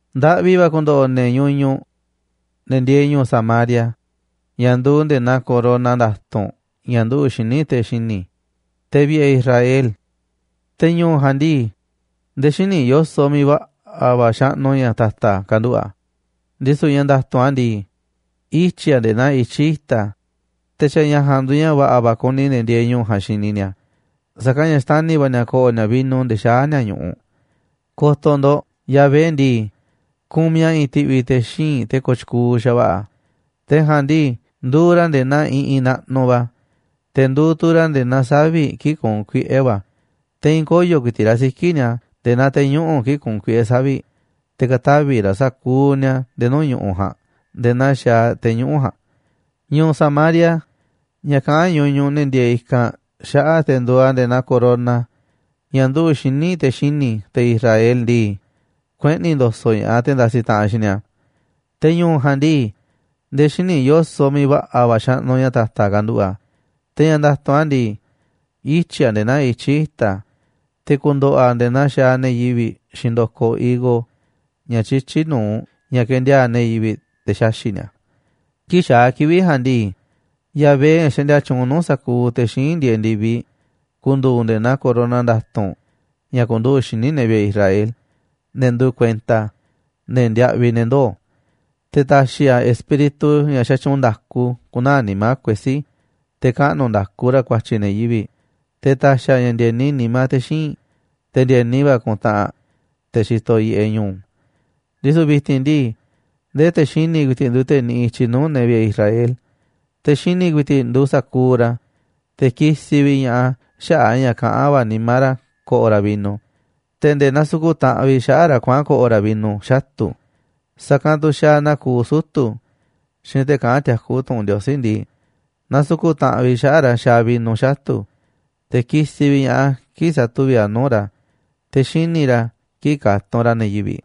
Ndaꞌvi va̱ ku̱ndo̱ꞌo̱ ne̱ ñuñuꞌ, ne̱ ndieeꞌ ñu̱u̱ Samaria, ña̱ nduuꞌ nde̱e̱ naa corona nda̱tu̱nꞌ ña̱ nduꞌu̱ꞌ xíniꞌ te̱ xini̱, te̱ vi̱ꞌe̱ Israel. Te̱ ñu̱u̱ ja̱a̱nꞌ ndii, nde̱e̱ xíniꞌ yo̱soꞌ miiꞌ va̱ꞌa̱ va̱ xaꞌnuꞌ ña̱ ta̱ta̱ kanduꞌu̱ꞌ a̱, ndisu̱ ña̱ nda̱tu̱nꞌ a̱ ndii, ityi̱ a̱ nde̱e̱ naa ityí i̱ta̱, te̱ xa̱ ña̱ ja̱a̱nꞌ nduuꞌ ña̱ va̱ꞌa̱ va̱ kuni ne̱ ndiee ñu̱u̱ ja̱a̱nꞌ xini ni̱a̱, sa̱kanꞌ ña̱ xtani̱ va̱ ni̱a̱ ko̱ꞌo̱ ni̱a̱ vino nde̱e̱ xaá ni̱a̱ ñu̱ꞌuꞌ. Ko̱to̱ ndo̱ꞌ, Yahvé ndii, kumiꞌ a̱ i̱i̱n ti̱ꞌvi̱ te̱ xíinꞌ te̱ kooꞌ tyukuuꞌ xa̱va̱ꞌa̱, te̱ ja̱a̱nꞌ ndii nduuꞌ ra̱ nde̱e̱ naa iꞌinꞌ naꞌnuꞌ va̱, te̱ nduuꞌ tu̱ ra̱ nde̱e̱ naa savi̱ꞌ kii̱ꞌ kuunꞌ kuiꞌe̱ va̱ a̱, te̱ i̱i̱n koyo̱ ku̱i̱ti̱ꞌ raꞌ siki̱ꞌ ni̱a̱ nde̱e̱ naa te̱ñuꞌu̱ꞌ kii̱ꞌ kuunꞌ kuiꞌe̱ savi̱ꞌ, te̱ ka̱tavi̱ raꞌ sa̱kuuꞌ ni̱a̱ nde̱e̱ nuu̱ꞌ ñu̱ꞌuꞌ ja̱a̱nꞌ nde̱e̱ naa xaaꞌ te̱ñuꞌu̱ꞌ ja̱a̱nꞌ. Ñu̱u̱ Samaria, ña̱ kaꞌán ñuñuꞌ ne̱ ndieeꞌ i̱kanꞌ xaꞌa̱ꞌ te̱ nduuꞌ a̱ nde̱e̱ naa corona ña̱ nduꞌu̱ꞌ xíniꞌ te̱ xini̱, te̱ Israel ndii, kueꞌni̱ ndo̱so̱ꞌ ña̱ꞌaꞌ te̱ ndasiꞌ taꞌanꞌ xiinꞌ ni̱a̱. Te̱ ñu̱u̱ ja̱a̱nꞌ ndii, nde̱e̱ xíniꞌ yo̱soꞌ miiꞌ va̱ꞌa̱ va̱ xaꞌnuꞌ ña̱ ta̱ta̱ kanduꞌu̱ꞌ a̱. Te̱ ña̱ nda̱tu̱nꞌ a̱ ndii, ityi̱ a̱ nde̱e̱ naa ityí i̱ta̱, te̱ ku̱ndo̱ꞌo̱ a̱ nde̱e̱ naa xaaꞌ ne̱ yivi̱ꞌ xiinꞌ ndo̱koꞌ higo ña̱ tyityí nu̱uꞌ ña̱ kendiaa̱ꞌ ne̱ yivi̱ꞌ te̱ xaxi̱ꞌ ni̱a̱ a̱. Kii̱ꞌ xaa̱ kivi̱ꞌ ja̱a̱nꞌ ndii, Yahvé, ña̱ xaꞌndia tyuunꞌ nuu̱ꞌ sa̱kuuꞌ te̱ xíinꞌ ndieeꞌ ndi̱viꞌ, ku̱ndu̱u̱ nde̱e̱ naa corona nda̱tu̱nꞌ ña̱ ku̱nduꞌu̱ꞌ xíniꞌ ne̱ vi̱ꞌe̱ Israel, ne̱ nduuꞌ kuenta a̱, ne̱ ndiaꞌviꞌ ne̱ ndoo̱. Te̱ ta̱xi̱ a̱ espíritu ña̱ xatyuunꞌ nda̱ku ku̱naa̱ nimá kuesí, te̱ kaꞌnu̱ nda̱ku ra̱ ku̱a̱tyi̱ ne̱ yivi̱ꞌ, te̱ ta̱xi̱ a̱ ña̱ ndi̱e̱ni nimá te̱ xíinꞌ, te̱ ndi̱e̱ni va̱ ku̱ntaꞌanꞌ, te̱ xitoꞌ yiꞌeꞌ ñu̱u̱. Ndisu̱ vi̱ti̱n ndii, ndee te̱ xini̱ ku̱i̱ti̱ꞌ nduuꞌ te̱ niꞌiꞌ i̱tyiꞌ nuu̱ꞌ ne̱ vi̱ꞌe̱ Israel, te̱ xini̱ ku̱i̱ti̱ꞌ nduuꞌ sa̱kuuꞌ ra̱, te̱ kisiꞌ vi̱ꞌ ña̱ꞌaꞌ a̱ xaꞌa̱ꞌ a̱ ña̱ kaꞌán va̱ nimá ra̱ ko̱ꞌo̱ ra̱ vino, te̱ nde̱e̱ nasuku̱ꞌ taꞌanꞌ vi̱ꞌ xaꞌa̱ꞌ ra̱ kuaꞌa̱n ko̱ꞌo̱ ra̱ vino xatu̱. Sa̱kanꞌ tu̱ xaaꞌ naa kuuꞌ sutu̱ xiinꞌ te̱ kaꞌán tiakú tu̱ꞌu̱n Ndiosí ndii, nasuku̱ꞌ taꞌanꞌ vi̱ꞌ xaꞌa̱ꞌ ra̱ xaaꞌ vino xatu̱, te̱ kisiꞌ vi̱ꞌ ña̱ꞌaꞌ a̱ kii̱ꞌ satuví a̱ nuu̱ꞌ ra̱, te̱ xini̱ ra̱ kii̱ꞌ katunꞌ ra̱ ne̱ yivi̱ꞌ.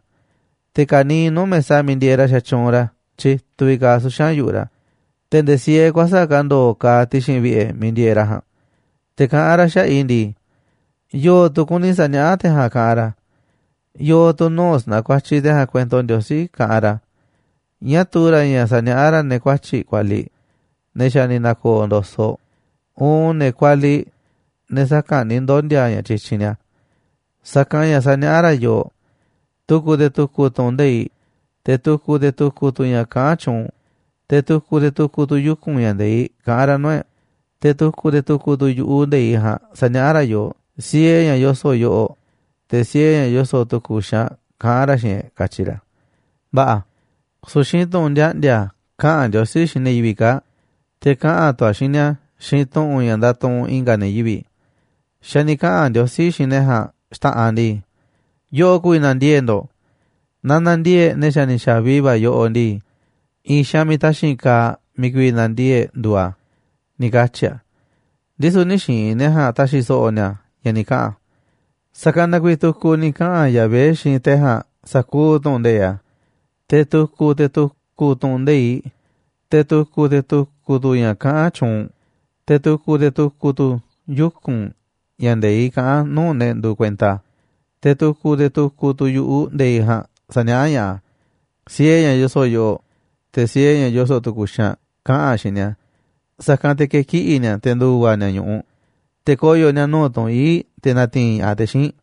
Te̱ ka̱niiꞌ nuu̱ꞌ mesa miiꞌ ndieeꞌ ra̱ xatyuunꞌ ra̱ tyituꞌ vi̱ꞌ kaaꞌ suxa̱n yu̱ꞌuꞌ ra̱, te̱ nde̱e̱ siee kuäsa̱ꞌ ka̱ ndo̱o̱ kaaꞌ ti̱xi̱n vi̱ꞌe̱ miiꞌ ndieeꞌ ra̱ ja̱a̱nꞌ. Te̱ kaꞌán ra̱ xaꞌa̱ꞌ i̱ ndii: “¿Yo̱o̱ tu̱ kuni sa̱niaꞌá te̱ ja̱a̱nꞌ, kaꞌanꞌ ra̱? ¿Yo̱o̱ tu̱ nuu̱ꞌ sa̱na̱kuatyiꞌ te̱ ja̱a̱nꞌ kuento Ndiosí kaꞌanꞌ ra̱? ¿Ñáá tuu ra̱ ña̱ sa̱niaꞌá ra̱ ne̱ kuatyi̱ꞌ kualiꞌ, ne̱ xa̱ ni̱ na̱ko̱o̱ ndo̱soꞌ uun ne̱ kualiꞌ, ne̱ saka̱nꞌ ni̱ ndondi̱a̱ ña̱ tyityinꞌ ni̱a̱? Sa̱kanꞌ ña̱ saniaꞌá ra̱ yooꞌ tu̱ku̱ te̱ tu̱ku̱ tu̱ꞌu̱n nde̱iꞌ, te̱ tu̱ku̱ te̱ tu̱ku̱ tu̱ ña̱ kaꞌán tyuunꞌ, te̱ tu̱ku̱ te̱ tu̱ku̱ tu̱ yuku̱n ña̱ nde̱iꞌ kaꞌán ra̱ nuu̱ꞌ e̱ꞌ, te̱ tu̱ku̱ te̱ tu̱ku̱ tu̱ yu̱ꞌuꞌ nde̱iꞌ ja̱a̱nꞌ saniaꞌá ra̱ yooꞌ siee ña̱ yoso̱ꞌ yoꞌoꞌ, te̱ siee ña̱ yoso̱ꞌ tu̱ku̱ xaanꞌ kaꞌán ra̱ xiinꞌ e̱ꞌ”, katyi ra̱. Va̱ꞌa̱, su̱u̱ xiinꞌ tu̱ꞌu̱n ndiaꞌndi̱a̱ kaꞌa̱n Ndiosí xiinꞌ ne̱ yivi̱ꞌ kaa̱ꞌ, te̱ kaꞌa̱n tu̱ a̱ xiinꞌ ni̱a̱ xiinꞌ tu̱ꞌu̱n ña̱ ndatuꞌunꞌ i̱nga̱ ne̱ yivi̱ꞌ. Xa̱ ni̱ kaꞌa̱n Ndiosí xiinꞌ ne̱ ja̱a̱nꞌ xta̱ꞌanꞌ ndii: “Yoꞌoꞌ ku̱vi̱ na̱ndiee̱ꞌ ndo̱ꞌ, na na̱ndiee̱ꞌ ne̱ xa̱ ni̱ xa̱vi va̱ yoꞌoꞌ ndii, i̱i̱n xaanꞌ miiꞌ taxi̱nꞌ kaaꞌ miiꞌ ku̱vi̱ na̱ndiee̱ꞌ e̱ꞌ nduuꞌ a̱”, ni̱ katyi̱ a̱. Ndisu̱ nï̱ xiinꞌ ne̱ ja̱a̱nꞌ ta̱xi̱ so̱ꞌo̱ ni̱a̱ ña̱ ni̱ kaꞌa̱n a̱. Sa̱kanꞌ na kuiiꞌ tu̱ku̱ ni̱ kaꞌa̱n Yahvé xiinꞌ te̱ ja̱a̱nꞌ sa̱kuuꞌ tu̱ꞌu̱n nde̱iꞌ a̱, te̱ tu̱ku̱ te̱ tu̱ku̱ tu̱ꞌu̱n nde̱iꞌ, te̱ tu̱ku̱ te̱ tu̱ku̱ tu̱ ña̱ kaꞌán tyuunꞌ, te̱ tu̱ku̱ te̱ tu̱ku̱ tu̱ yuku̱n ña̱ nde̱iꞌ kaꞌán a̱ nuu̱ꞌ ne̱ nduuꞌ kuenta a̱, te̱ tu̱ku̱ te̱ tu̱ku̱ tu̱ yu̱ꞌuꞌ nde̱iꞌ ja̱a̱nꞌ saniaꞌá ña̱ꞌaꞌ a̱ siee ña̱ yoso̱ꞌ yoꞌoꞌ, te̱ siee ña̱ yoso̱ꞌ tu̱ku̱ xaanꞌ kaꞌa̱n a̱ xiinꞌ ni̱a̱, sa̱kanꞌ te̱ ke̱kiꞌi̱ ni̱a̱ te̱ ndu̱va̱ ni̱a̱ ñu̱ꞌuꞌ, te̱ koyo̱ ni̱a̱ nuu̱ꞌ tunꞌ ii̱ꞌ te̱ na̱ti̱i̱n ña̱ꞌaꞌ te̱ xíinꞌ.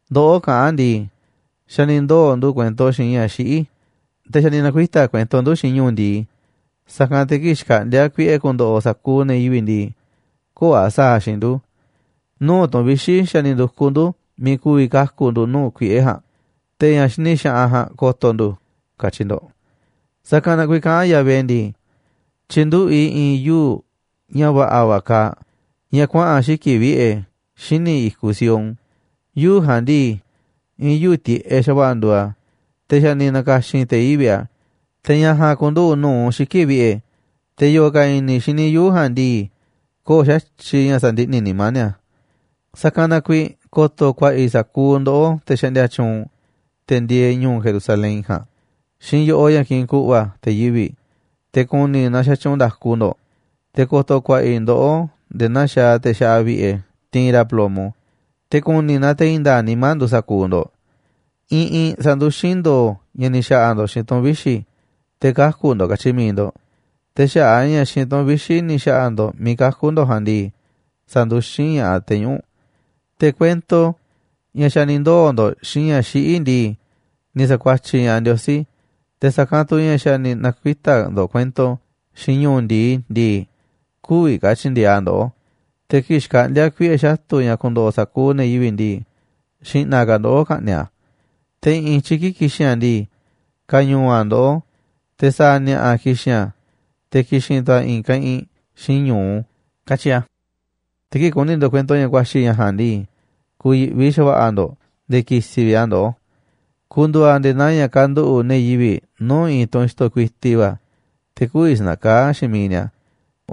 Ndoꞌó kaꞌán ndii: “Xa̱ ni̱ ndoo̱ ndu̱ꞌ kuento xiinꞌ ña̱ xiꞌí, te̱ xa̱ ni̱ na̱kuita̱ kuento ndu̱ xiinꞌ ñu̱u̱ ndi̱i, sa̱kanꞌ te̱ kii̱ꞌ xkaꞌndi̱a̱ kuiꞌe̱ ku̱ndo̱ꞌo̱ sa̱kuuꞌ ne̱ yivi̱ꞌ ndii, köo̱ꞌ a̱ sa̱a̱ a̱ xiinꞌ ndu̱. Nuu̱ꞌ tu̱n vixi̱ xa̱ ni̱ ndu̱kuꞌ ndu̱ miiꞌ ku̱vi̱ kaku̱ ndu̱ nuu̱ꞌ kuiꞌe̱ ja̱a̱nꞌ, te̱ ña̱ xini xaꞌanꞌ ja̱a̱nꞌ ko̱to̱ ndu̱”, katyi ndo̱ꞌ. Sa̱kanꞌ na kuiiꞌ kaꞌán Yahvé ndii: “Tyi̱nduꞌu̱ꞌ i̱ i̱i̱n yuu̱ꞌ ña̱ va̱ꞌa̱ va̱ kaaꞌ, ña̱ kuaꞌa̱n xiki̱ꞌ vi̱ꞌe̱ xíniꞌ i̱kuꞌ Sión. Yuu̱ꞌ ja̱a̱nꞌ ndii, i̱i̱n yuu̱ꞌ tiꞌeꞌ xa̱va̱ꞌa̱ nduuꞌ a̱, te̱ xa̱ ni̱ na̱ka̱xi̱n te̱ yivi̱ꞌ a̱, te̱ ña̱ ja̱a̱nꞌ ku̱nduꞌu̱ꞌ nu̱uꞌ xiki̱ꞌ vi̱ꞌe̱, te̱ yo̱o̱ ka̱ i̱ni̱ xini yuu̱ꞌ ja̱a̱nꞌ ndii, köo̱ꞌ xa̱tyiꞌ ña̱ sa̱ndiꞌni̱ nimá ni̱a̱. Sa̱kanꞌ na kuiiꞌ ko̱to̱ ku̱a̱ꞌa̱ i̱ sa̱kuuꞌ ndoꞌó, te̱ xaꞌndia tyuunꞌ, te̱ ndieeꞌ ñu̱u̱ Jerusalén ja̱a̱nꞌ, xiinꞌ yo̱ꞌoꞌ ña̱ kiꞌinꞌ ku̱ꞌva̱ te̱ yivi̱ꞌ, te̱ ku̱ni̱ i̱ naaꞌ xatyuunꞌ nda̱ku ndo̱ꞌ, te̱ ko̱to̱ ku̱a̱ꞌa̱ i̱ ndoꞌó nde̱e̱ naa xaaꞌ te̱ xaꞌa vi̱ꞌe̱ tiinꞌ ra̱ plomo, te̱ ku̱ni̱ i̱ naaꞌ te̱ i̱i̱n nda̱a̱ꞌ nimá nduuꞌ sa̱kuuꞌ ndo̱ꞌ. Iꞌinꞌ sa̱nduxín ndo̱o̱ ña̱ ni̱ xa̱ꞌa̱ ndo̱ꞌ xiinꞌ tu̱n vixi̱, te̱ kaku̱ ndo̱ꞌ, katyi mi̱iꞌ ndo̱ꞌ. Te̱ xaꞌa̱ꞌ a̱ ña̱ xiinꞌ tu̱n vixi̱ ni̱ xa̱ꞌa̱ ndo̱ꞌ miiꞌ kaku̱ ndo̱ꞌ ja̱a̱nꞌ ndii, sa̱nduxín ña̱ꞌaꞌ te̱ñuꞌu̱ꞌ. Te̱ kuento ña̱ xa̱ ni̱ ndoo̱ ndo̱ꞌ xiinꞌ ña̱ xiꞌí ndii, ni̱ sa̱kuatyiꞌ ña̱ꞌaꞌ Ndiosí, te̱ sa̱kanꞌ tu̱ ña̱ xa̱ ni̱ na̱kuita̱ ndo̱ꞌ kuento xiinꞌ ñu̱u̱ ndi̱i ndii, kü̱vi̱ ka̱ tyi̱ndi̱e̱eꞌ a̱ ndoꞌó, te̱ kii̱ꞌ xkaꞌndi̱a̱ kuiꞌe̱ xatu̱ ña̱ ku̱ndo̱ꞌo̱ sa̱kuuꞌ ne̱ yivi̱ꞌ ndii, xi̱ꞌna̱ ka̱ ndoꞌó ka̱ꞌni̱ꞌ a̱. Te̱ i̱ꞌi̱n i̱tyiꞌ kii̱ꞌ ki̱xi̱n a̱ ndii, ka̱ñu̱u̱ a̱ ndoꞌó, te̱ sa̱a̱ ni̱a̱ꞌa̱ ki̱xi̱n a̱, te̱ ki̱xi̱n tu̱ a̱ i̱i̱n keꞌinꞌ xiinꞌ ñu̱u”, katyi a̱. Te̱ kii̱ꞌ ku̱ni̱ ndo̱ꞌ kuento ña̱ ku̱a̱xi̱ ña̱ ja̱a̱nꞌ ndii, ku̱yi̱ꞌvi xa̱va̱ꞌa̱ ndo̱ꞌ nde̱e̱ ki̱si̱ vi̱ꞌ a̱ ndoꞌó. Ku̱ndu̱u̱ a̱ nde̱e̱ naa ña̱ kanduꞌu̱ꞌ i̱i̱n ne̱ yivi̱ꞌ nuu̱ꞌ i̱i̱n tunꞌ xto̱ kuiti va̱, te̱ kü̱vi̱ sa̱na̱kaá xiinꞌ miiꞌ ni̱a̱,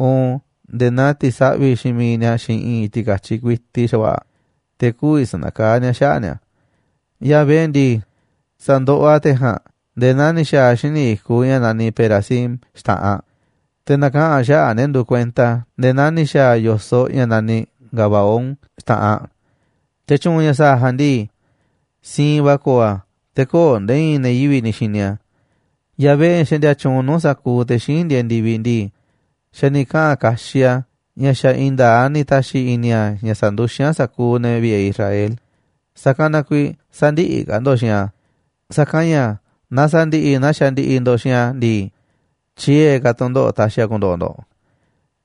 uun nde̱e̱ naa ti̱saꞌvi̱ xiinꞌ miiꞌ ni̱a̱ xiinꞌ i̱i̱n ti̱ka̱tyiꞌ kuiti xa̱va̱ꞌa̱, te̱ kü̱vi̱ sa̱nakaá ni̱a̱ xaꞌa̱ꞌ ni̱a̱. Yahvé ndii, sa̱ndoꞌoꞌ a̱ te̱ ja̱a̱nꞌ nde̱e̱ naa ni̱ xa̱a̱ a̱ xíniꞌ i̱kuꞌ ña̱ naniꞌ Perazim xta̱ꞌanꞌ, te̱ na̱kaꞌa̱n a̱ xaꞌa̱ꞌ ne̱ nduuꞌ kuenta a̱ nde̱e̱ naa ni̱ xa̱a̱ a̱ yo̱soꞌ ña̱ naniꞌ Gabaón xta̱ꞌanꞌ. Te̱ tyu̱u̱n ña̱ sa̱a̱ a̱ ja̱a̱nꞌ ndii, siinꞌ va̱ ko̱o̱ a̱, te̱ köo̱ꞌ nde̱e̱ i̱i̱n ne̱ yivi̱ꞌ ni̱ xini a̱. Yahvé, ña̱ xaꞌndia tyuunꞌ nuu̱ꞌ sa̱kuuꞌ te̱ xíinꞌ ndieeꞌ ndi̱viꞌ ndii, xa̱ ni̱ kaꞌa̱n kaxiꞌ a̱ ña̱ xa̱ i̱i̱n nda̱a̱ꞌ a̱ ni̱ ta̱xi̱ i̱ni̱ a̱ ña̱ sa̱nduxín a̱ sa̱kuuꞌ ne̱ vi̱ꞌe̱ Israel, sa̱kanꞌ na kuiiꞌ sä̱ndi̱ꞌi̱ ka̱ ndo̱ꞌ xiinꞌ a̱, sa̱kanꞌ ña̱ naaꞌ sa̱ndi̱ꞌi̱ naa xandiꞌiꞌ ndo̱ꞌ xiinꞌ a̱ ndii, tyiee̱ ka̱ tu̱ndoꞌo̱ꞌ ta̱xi̱ a̱ ku̱ndo̱ꞌo̱ ndo̱ꞌ.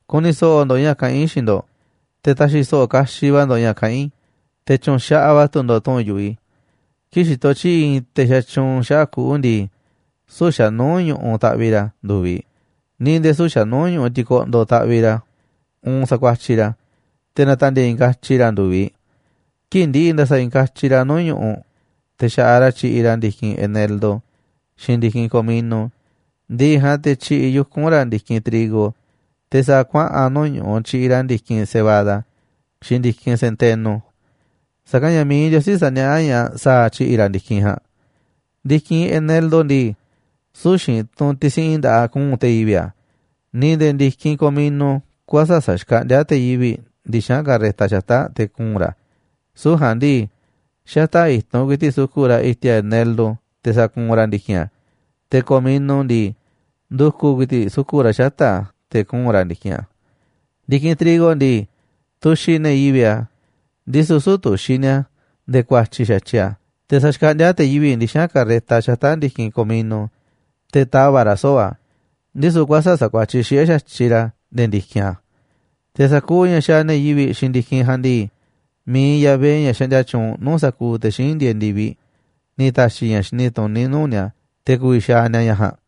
Ku̱ni̱ so̱ꞌo̱ ndo̱ꞌ ña̱ kaꞌán i̱ xiinꞌ ndo̱ꞌ, te̱ ta̱xi̱ so̱ꞌo̱ kaxiꞌ va̱ ndo̱ꞌ ña̱ kaꞌán i̱, te̱ tyu̱nxaꞌaꞌ va̱ tu̱ ndo̱ꞌ tu̱ꞌu̱n yu̱ꞌuꞌ i̱. Kii̱ꞌ xitoꞌ tyi̱ꞌi̱ i̱i̱n te̱ xatyuunꞌ xaꞌa̱ꞌ kuꞌu̱ ndii, süu̱ꞌ xa̱ nuu̱ꞌ ñu̱ꞌuꞌ taꞌviꞌ ra̱ ndu̱viꞌ, ni̱ nde̱e̱ süu̱ꞌ xa̱nuu̱ꞌ ñu̱ꞌuꞌ tikoꞌndoꞌ taꞌviꞌ ra̱ uun sakuatyiꞌ ra̱, te̱ natandieeꞌ i̱i̱n katyi ra̱ a̱ ndu̱viꞌ. Kii̱ꞌ ndi̱ꞌi̱ ndasaꞌ i̱i̱n katyi ra̱ nuu̱ꞌ ñu̱ꞌuꞌ, te̱ xa̱ꞌaꞌ ra̱ tyiꞌiꞌ ra̱ ndi̱kinꞌ eneldo xiinꞌ ndi̱kinꞌ komino, ndi̱ꞌi̱ ja̱a̱nꞌ te̱ tyiꞌiꞌ yuku̱n ra̱ ndi̱kinꞌ trigo, te̱ sa̱a̱ kuaꞌa̱n nuu̱ꞌ kuꞌu̱ tyiꞌiꞌ ra̱ ndi̱kinꞌ cebada xiinꞌ ndi̱kinꞌ centeno. Sa̱kanꞌ ña̱ mi̱iꞌ Ndiosí saniaꞌá ña̱ꞌaꞌ sa̱a̱ tyi̱ꞌi̱ ra̱ ndi̱kinꞌ ja̱a̱nꞌ. Ndi̱kinꞌ eneldo ndii, süu̱ꞌ xiinꞌ tunꞌ tisiꞌin nda̱ꞌaꞌ kuu̱nꞌ te̱ yivi̱ꞌ a̱, ni̱ nde̱e̱ ndi̱kinꞌ comino kuäsa̱ꞌ saxkaꞌndíá te̱ yivi̱ꞌ ndixa̱nꞌ carreta xata̱ꞌ te̱ kuu̱nꞌ ra̱ a̱, süu̱ꞌ ja̱a̱nꞌ ndii, xata̱ꞌ i̱tunꞌ ku̱i̱ti̱ꞌ suku̱ꞌ ra̱ i̱ti̱a̱ eneldo te̱ sakuunꞌ ra̱ ndi̱kinꞌ a̱, te̱ comino ndii, ndu̱ku̱ ku̱i̱ti̱ꞌ suku̱ꞌ ra̱ xata̱ꞌ a̱ te̱ kuu̱nꞌ ra̱ ndi̱kinꞌ a̱. Ndi̱kinꞌ trigo ndii, tuxiꞌ ne̱ yivi̱ꞌ a̱, ndisu̱ süu̱ꞌ tuxiꞌ ni̱a̱ nde̱e̱ ku̱a̱tyi̱ xa̱tyiꞌ a̱, te̱ saxkaꞌndíá te̱ yivi̱ꞌ ndixa̱nꞌ carreta xata̱ꞌ ndi̱kinꞌ comino, te̱ tava̱ꞌ ra̱ soo̱ꞌ a̱, ndisu̱ kuäsa̱ꞌ sakuatyiꞌ xiꞌe̱ xa̱tyiꞌ ra̱ nde̱e̱ ndi̱kinꞌ a̱. Te̱ sa̱kuuꞌ ña̱ xaaꞌ ne̱ yivi̱ꞌ xiinꞌ ndi̱kinꞌ ja̱a̱nꞌ ndii, mi̱iꞌ Yahvé, ña̱ xaꞌndia tyuunꞌ nuu̱ꞌ sa̱kuuꞌ te̱ xíinꞌ ndieeꞌ ndi̱viꞌ, ni̱ ta̱xi̱ ña̱ xini tuní nuu̱ꞌ ni̱a̱ te̱ ku̱vi̱ xaaꞌ ni̱a̱ ña̱ ja̱a̱nꞌ.